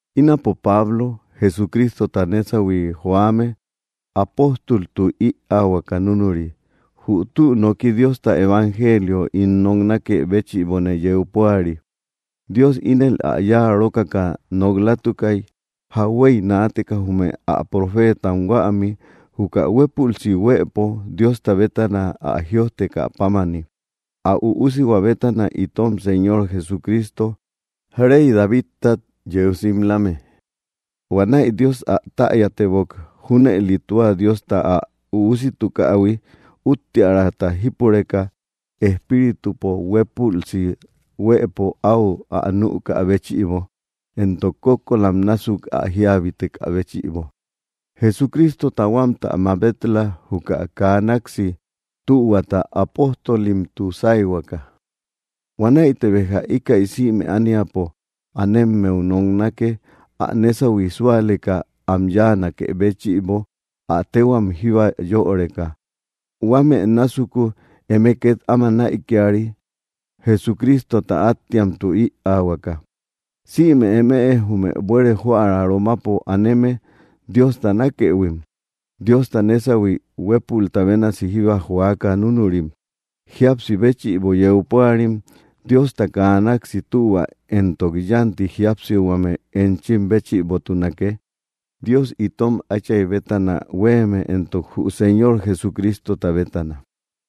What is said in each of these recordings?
Ínapo Pablo, Jesucristota nésahui joame, apóstoltu ïaahuaka núnuri. Jü tü nooki Diosta evangelio ín noknakë béchïbone yeu púari. Dios ínel ä yáa rókaka nok‑latukay, jauhuey naateka jume ä profeetam huämi, juka huépülsi huëpo Diosta bétana ä jïojtekä pámani, ä Üusihua bétana, itom Señor Jesucristo, rey Davidtat yeu simlame. Huanäi Dios ä täyatebok; junëli tua Diosta ä Üusitukähui, úttiärata jípureka, Espíritupo huépülsi huëpo áu ä nükä béchïbo, entok kókkolam násuk ä jíabitekä béchïbo. Jesucristota huámtä mabet‑la juka kaa náksi tühuata apóstolimtu sáyhuakä. Huanäite béja íkäi sïme ániapo anemmeu noknake, ä nésahui súaleka am yáanakë béchïbo, ä téhuam jíba yöreka. Huámë násuku eme két áma näikiari, Jesucristota áttiamtu ïaahuaka. Sïme eme jume buere joära Romapo aneme, Diosta nákëhuim, Diosta nésahui huépulta bénasi jíba joaka núnurim, jíapsi béchïbo yeu púarim: Diosta kaa náksi tühua entok yánti jíapsihuame enchim béchïbotunake, Dios itom Áchay bétana huéeme entok jü Señor Jesucristota bétana.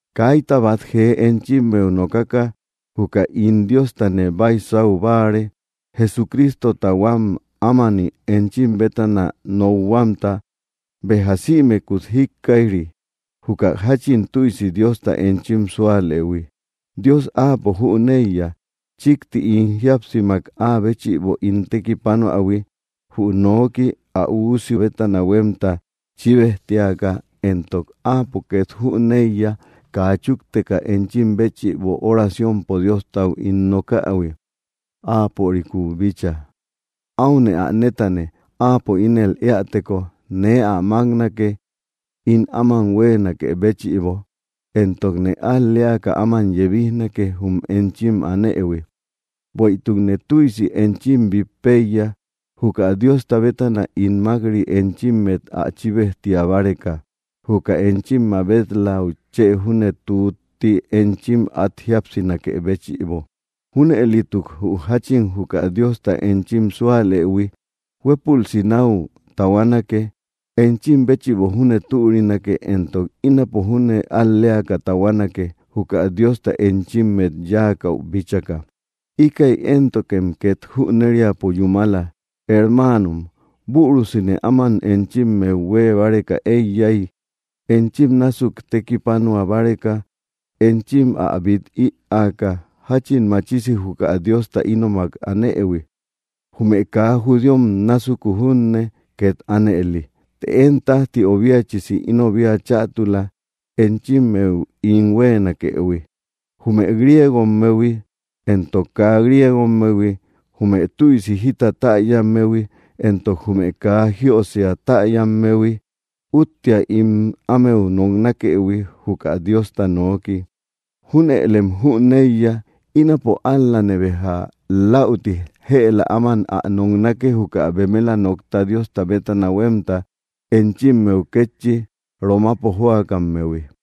Kaita bát jee enchimmeu nokaka juka ín Diostane baisau báare, Jesucristota huám ámani enchim bétana nokhuamta. Béja sïmekut jíkkaij‑ri, juka jáchin tüisi Diosta enchim súalëhui. Dios Áapo jüneiya, chíkti ín jíapsimak áa béchïbo ín tekipanoähui, jü noki ä Üusi bétana huémta chíbejtiaka, entok Áapo két jüneiya, kaa chúkteka enchim béchïbo oraciompo Diostau ín nokähui, Áaporikúu bícha. Áune ä nétane, áapo ínel éäteko nee ä máknake, ín áman huéenakë béchïbo, entokne al‑leaka áman yebijnake jum enchim anëhui. Bueïtukne tüisi enchim bít péiya, juka Diosta bétana ín mák‑ri enchimmet ä chíbejtia báreka, juka enchim mabet‑läu chë júne tútti enchim át jíapsinakë béchïbo. Júnëlituk jü jáchin juka Diosta enchim súalëhui huépülsi náu tahuanake, enchim béchïbo júne türinake entok ínapo júne al‑leaka tahuanake, juka Diosta enchimmet yáakäu bíchaka. Íkäi éntokem két jüneriapo yúmala, hermaanom, bürusine áman enchimmeu huée báreka eiyay, enchim násuk tekipanua báreka enchim ä bít ïaaka, jáchin machisi juka Diosta ínomak anëhui, jume kaa judíom násuku júne két ánëli. Të én tájti obiachisi ínobia chätula, enchimmeu ín huéenakëhui. Jume griegommehui entok kaa griegommehui, jume tüisi jita täyammehui entok jume kaa jíösia täyammehui, úttia ín ámeu noknakëhui, juka Diosta nooki. Júnëlem jüneiya, ínapo ál‑lane béja läuti jëla áman ä noknake, juka bemela nokta Diosta bétana huémta enchimmeu kétchi, Romapo joakammehui.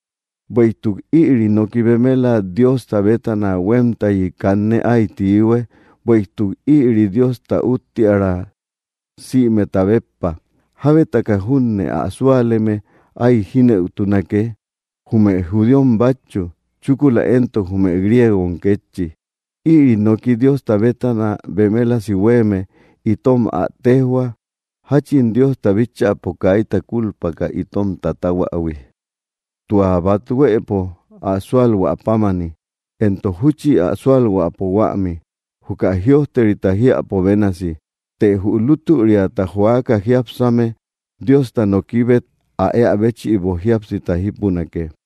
Bueïtuk ïri noki bemela Diosta bétana huémtayi kanne áy tiihue, bueïtuk ïri Diosta úttiära, sïmeta béppa. Jábetaka junne ä súaleme áy jínëutunake, jume judíom bátchu, chúkula éntok jume griegom kétchi. Ïri noki Diosta bétana bemelasi huéeme itom ä téjhua, jáchin Diosta bíchäpo kaita kulpaka itom tatahuähui: tua bát huëpo ä súalhuä pámani, entok júchi ä súalhuäpo huämi, juka jïojterita jiäpo bénasi: “Të jü lútüriata joaka jiápsame Diosta nokibet ä ea béchïbo jíapsita jípunake.”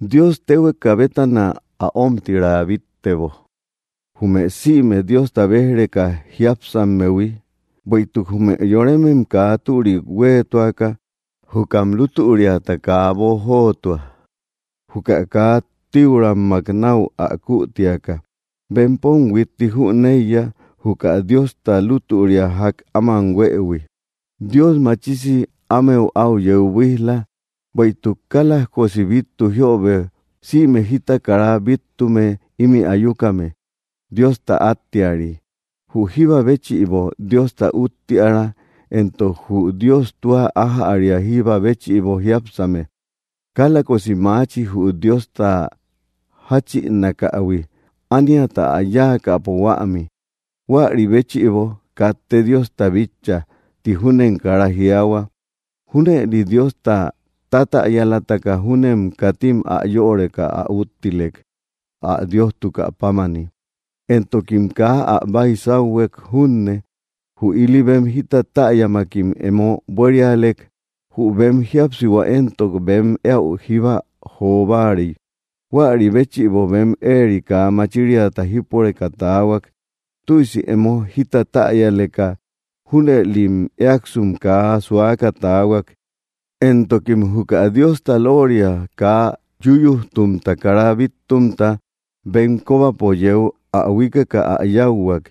Dios téhueka bétana ä ómtira bíttebo, jume sïme Diosta béj‑reka jiápsammehui, bueïtuk jume yoremem kaa türik huéetuaka, jukam lútüriata kaa boojotua, juka kaa tíuramak náu ä kütiaka. Bempom huitti jüneiya, juka Diosta lútüria ják áman huëhui. Dios machisi ámeu áu yeu buíj‑la. Bueïtuk kálajkosi bíttu jiöbe, sïme jita kara bíttume ímï ayukame Diosta áttiari: jü jíba béchïbo Diosta úttiära, entok jü Dios tua ájäria jíba béchïbo jiápsame. Kálajkosi maachi, jü Diosta jáchïnakähui, ániata ä yáakäpo huämi. Huäri béchïbo, “katte Diosta bitcha”, ti júnem kara jiaahua. Júnëli Diosta tatäyalataka júnem, katim ä yöreka ä úttilek, ä Diostukä pámani, entokim kaa ä baisauhuek junne. Jü ili bem jita täyämakim emo buérialek; jü bem jíapsihua entok bem éäu jíba jo báarey. Huäri béchïbo bem éeri kaa machiriata jípureka taahuak. Tüisi emo jita täyaleka, junëli éakasum kaa susuaka taahuak, entokim juka Diosta lóoria kaa yuyujtumta kara bíttumta bem kóbapo yeu ä huíkeka ä yáuhuak,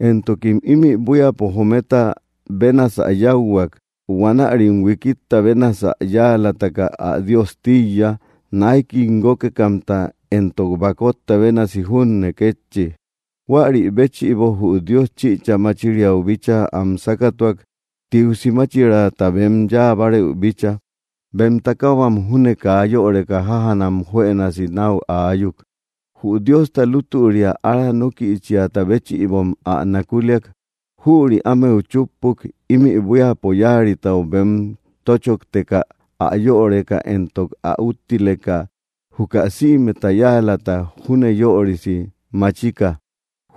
entokim ímï buíapo jometa bénasä yáuhuak. Huanärim huikitta bénasä yáalataka ä Dios tíiya, náikim guókekamta entok bakotta bénasi junne kétchi. Huäri béchïbo jü Dios chïcha máchiriau bíchaa am sákatuak, tiusi máchiraata bem yáa bárëu bícha; bem takahuam júne kaa yöreka jájanam juënasi náu aayuk. Jü Diosta lútüria ára nókïchiata béchïbom ä nakuliak; jüri ámeu chúppuk, ímï buíapo yáaritau bem tochokteka ä yöreka entok ä úttileka, juka sïmeta yáalata júne yöri máchika;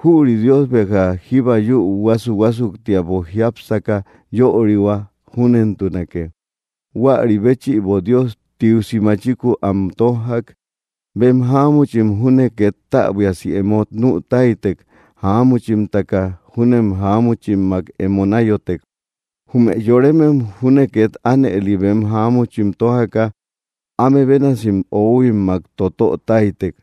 jüri Dios béja jíba yúu huásu‑huásuktiapo jiápsaka yörihua. Júnentunake. Huäri béchïbo Dios tiusi machikuu am tójjak. Bem jáamuchim júne két täbuiasi emo nü táytek; jáamuchimtaka júnem jáamuchimmak emo náyotek. Jume yoremem júne két ánëli, bem jáamuchim tójaka, áme bénasi oohuimmakim totö táytek,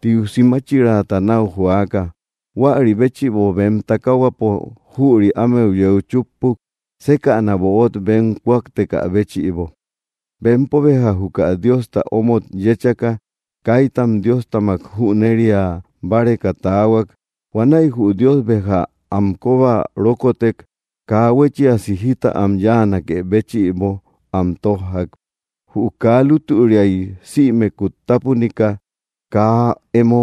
tiusi máchiraata náu joaka. Huäri béchïbo bem takahuapo jüri ámeu yeu chúppuk, sékäna böot bem kuaktekä béchïbo. Bempo béja juka Diosta omot yéchaka, kaitam Diostamak jüneria báreka taahuak. Huanäi jü Dios béja am kóba rókotek, kaa huéchiasi jita am yáanakë béchïbo am tójjak. Jü kaa lútüriay sïmekut tápunika, kaa emo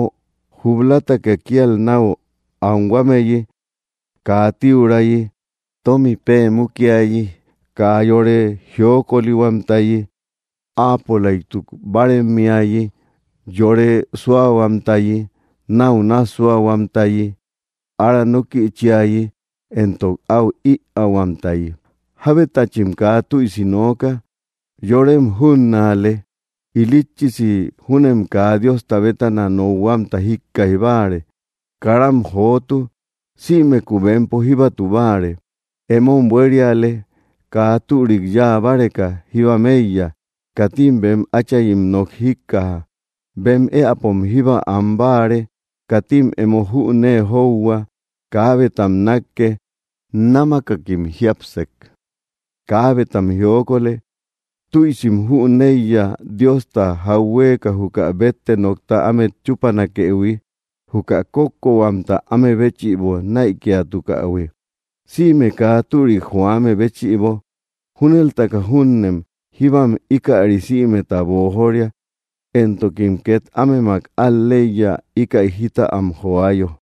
jub‑lataka kíal náu anhuameyi, kaa tiurayi, tómi pée mukiayi, kaa yore jiokolihuamtayi, áapolaytu báaremmiayi, yore súahuamtayi, náu nássuahuamtayi, ára nókïchiayi entok áu ïaahuamtayi. Jábetachim kaa tüisi nooka, yorem júnnaale; ilitchisi júnem kaa Diosta bétana nokhuamta jíkkaij báare; karam jotu; sïmeku bempo jíbatu báare; emom buériale, kaa türik yáa báreka jíbam éiya; katim bem áchayim nok jíkkaja; bem éäpom jíba an báare; katim emo jünee johua; kaabetam nákke; námakakim jiapsek; kaabetam jiokolë. Tüisim jüneiya, Diosta jauhueeka juka bétte nokta ámet chúpanakëhui, juka kókkohuamta áme béchïbo näikiatukähui, sïme kaa türik joame béchïbo; júneltaka júnem jíba ikärim sïmeta boojoria, entokim két ámemak al‑leiya, íkäi jita am joayo.